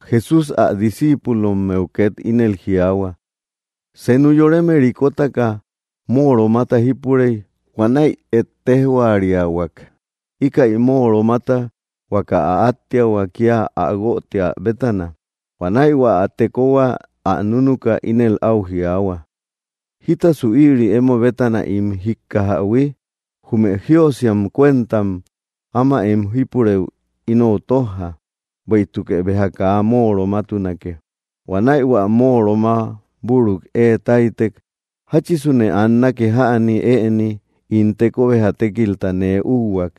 Jesús ä discíipulommeu két ínel jiaahua: —Senu yoreme rikotaka móoromata jípurey. Huanäi ejtejhuariahuak íkäi móoromata huaka ä áttiahua kía ä guötiä bétana. Huanäi hua ä tekohua ä núnuka ínel áu jiaahua: “¿Jítasu ïri emo bétana ín jíkkajähui? Jume jíösiam cuentam áma em jípurëu inou tójja, bueïtukë béja kaa móoromatunake.” Huanäi hua móoroma büruk ée táytek: “¿Jáchisune annake jäni ëni ín teko béja tékilta nee úhuak?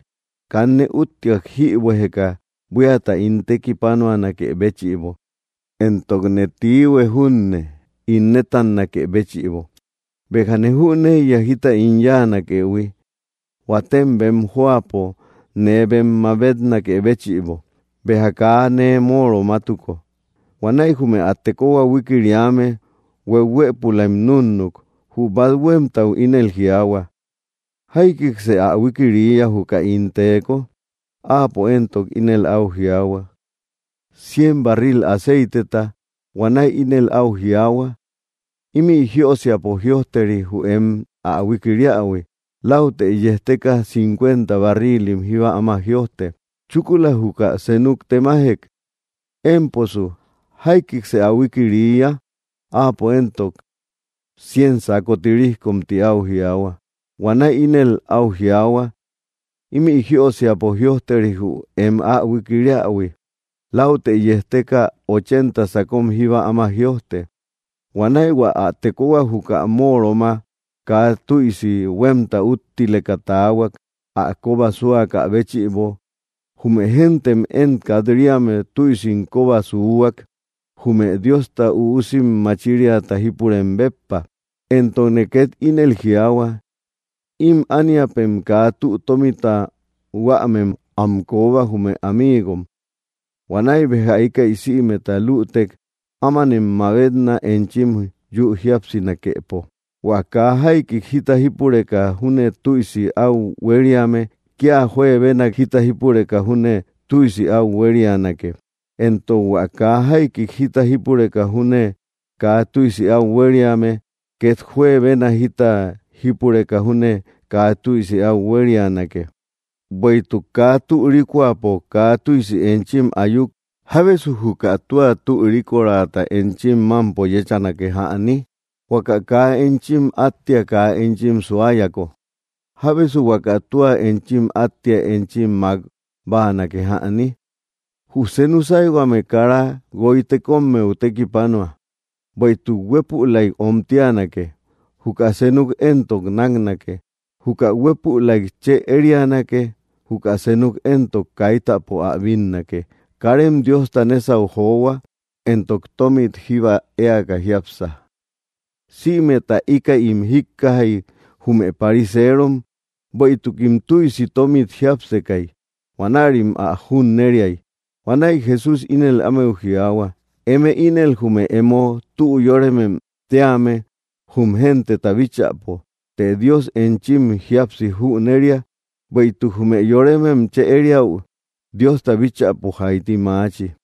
Kanne úttiak jïbuejeka buíata ín tekipanuanakë béchïbo, éntokne tiihue júne ín nétannakë béchïbo. Béjane jüneiya jita ín yáanakëhui, huatem bem jóapo nee bem mabetnakë béchïbo, béja kaa nee móoromatuko.” Huanäi jume ä tekohua huikiriame hueuhuëpulaim núnnuk. Jü bát huémtau ínel jiaahua: “¿Jaikiksë ä huikiriiya juka ín teeko?” Áapo éntok ínel áu jiaahua: “Cien barril aceiteta.” Huanäi ínel áu jiaahua: “Ímï jíösiapo jïojteri jü em ä huikiriähui. Läutë yejteka, cincuenta barrilim jíba áma jïojte.” Chúkula júchi senuk temajek: “Émposu, ¿jaikiksë ä huikiriiya?” Áapo éntok: “Cien sako tirijkom ti au jiaahua.” Huanäi ínel áu jiaahua: “Ímï jíösiapo jïojteri jü em ä huikiriähui. Läutë yejteka, ochenta sakom jíba áma jïojte.” Huanäi hua ä tekohua juka móoroma kaa tüisi huémta úttileka taahuak, ä kóba súakä béchïbo. Jume géntem én kat‑riame tüisim kóba súhuak, jume Diosta üusim machiriata jípureme béppa. ’Éntokne két ínel jiaahua: Ím ániapem kaa tü tómita huämem am kooba, jume amiigom. Huanäi béja íkäi sïmeta lütek, ámanem mabetna, enchim yü jíapsinakepo. ’Huä kaa jaikik jita jípureka júne tüisi áu huériame, kía juebenak jita jípureka júne tüisi áu huérianake; éntok hua kaa jaikik jita jípureka júne kaa tüisi áu huériame, két juebenak jita jípureka júne kaa tüisi áu huérianake. Bueïtuk kaa tü rikoapo kaa tüisi enchim ayuk, ¿jábesu juka tua tü rikorata enchim mámpo yéchanake jäni? Huaka kaa enchim áttia kaa enchim suayako, ¿jábesu huaka tua enchim áttia enchim mák báanakejäni? ’Jü senu sáyhuame kara guoy tekommeu tekipanua; bueïtuk huépülaik omtianake; juka senuk éntok náknake. Juka huépülaik chë érianake; juka senuk éntok, kaitäpo ä bínnake. Karem Diosta nésau johua, éntok tómit jíba éaka jiápsa. Sïmeta íkäim jíkkajay jume pariseerom, bueïtukim tüisi tómit jiápsekay. Huanärim ä junneriay. Huanäi Jesús ínel ámeu jiaahua: —Eme ínel jume emo tü yóremem tíame jum genteta bíchäpo, të Dios enchim jíapsi jüneria; bueïtuk jume yoremem chë ériäu, Diosta bíchäpo jaiti maachi.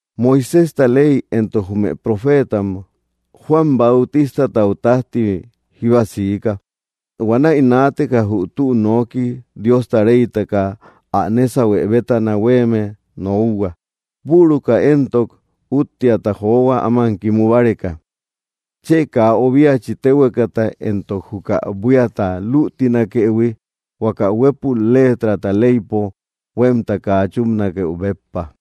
’Moiséjta ley éntok jume profeetam Juan Bautistatau tájti jíba siika. Huanäi naateka jü tü noki Diosta reytaka ä nésahue bétana huéeme nokhua. Büruka éntok úttiata johua, áman kimu báreka. ’Chë kaa obiachi téhuekata éntok juka buíata lütinakëhui, huaka huépul léetrata leypo huémta kaa chúpanakeu béppa.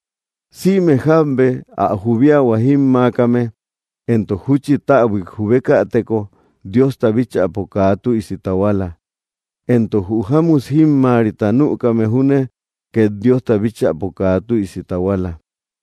’Sïme jábe ä jubiahua jímmaakame, éntok júchi täbuik jubekäteko, Diosta bíchäpo kaa tüisi tahuala. Entok jü jámut jímmaarita nükame junne, két Diosta bíchäpo kaa tüisi tahuala.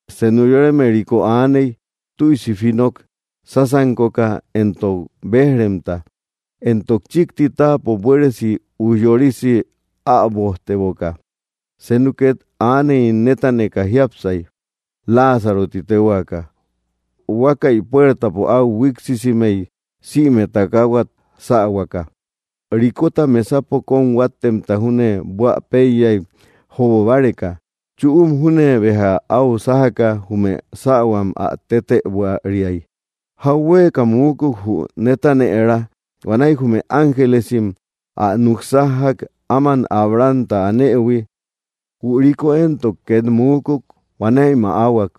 ’Senu yoreme riko aaney, tüisi finok sásankoka éntok béj‑remta, éntok chíkti táapo buéresi ujyorisi äbojteboka. Senu két aaney netaneka jiápsay, Láazaro ti téhuaaka, huakaï puertapo au huiksisimey sïmet takahuat sähuaka. Rikota mesapo kóm huáttemta júne buä péiyay jobobáreka. Chüum júne béja áu sájaka, jume sähuam ä tetëbuariay. Jauhueka muukuk, jü netanëra. Huanäi jume ángelesim ä núk sájjak, áman Abrahamta anëhui. Jü riko éntok két muukuk; huanäi mäahuak.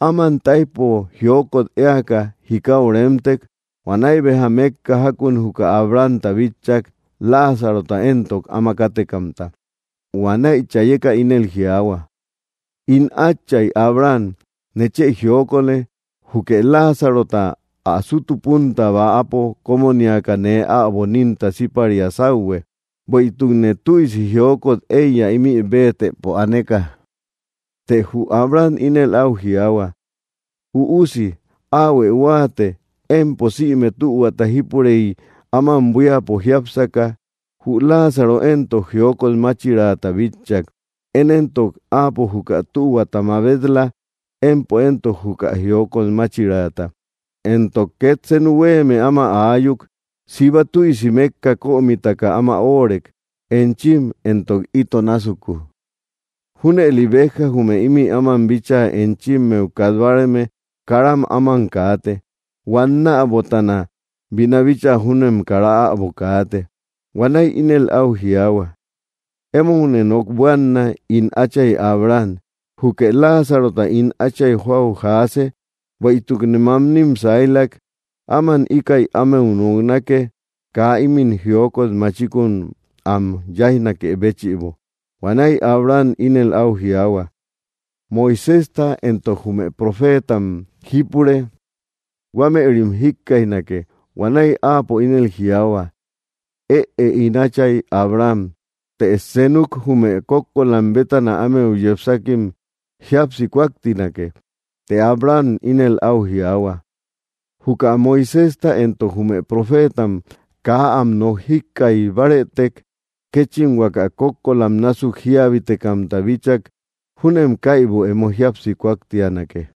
Áman táijpo jiokot éaka, jikau remtek. Huanäi béja mékka jákun juka Abrahamta bitchak, Láazarota éntok áamak kátekamta. Huanäi chaayeka ínel jiaahua: “¡In átchay Abraham, nechë jiokolë! Jukë Láazarota ä sútu púnta bäapo kómoniaka nee äbo nínta síparia sáuhue. Bueïtukne tüisi jiokot éiya ímï béetëpo aneka.” Të jü Abraham ínel áu jiaahua: “Üusi, áahuë huáate, empo sïme tühuata jípurey áman buíapo jiápsaka, jü Láazaro éntok jiokot máchiraata bitchak. Én éntok, áapo juka tühuata mabet‑la, empo éntok juka jiokot máchiraata. Éntok két senu huéeme áma aayuk: Siba tüisi mékka kömitaka áma óorek enchim éntok ito násuku. Júnëli béja jume ímï áman bíchaa enchimmeu kat báareme, kara áman kaate. Huannäbotana bina bíchaa júnem kara äbo kaate.” Huanäi ínel áu jiaahua: ‘‘Emoune nok buaana, ín átchay Abraham, jukë Láazarota ín átchay jóau jaase, bueïtukne mamnim sailak. Áman íkäi ámeu noknake, kaa ímin jiokot machikun am téunakë béchïbo.” Huanäi Abraham ínel áu jiaahua: “Moiséjta éntok jume profeetamim jípure; ¡huamerim jikkaijnake!” Huanäi áapo ínel jiaahua: “Ëe, ín átchay Abraham, të senuk jume kókkolam bétana ámeu yepsakim jíapsi kúaktinake.” Të Abraham ínel áu jiaahua: ‘‘Juka Moiséjta éntok jume profeetam kaa am nok jíkkaij bárëtek, kéchim huaka kókkolam násuk jíabitekamta bíchak júnem kaibum emo jíapsi kúaktianake.”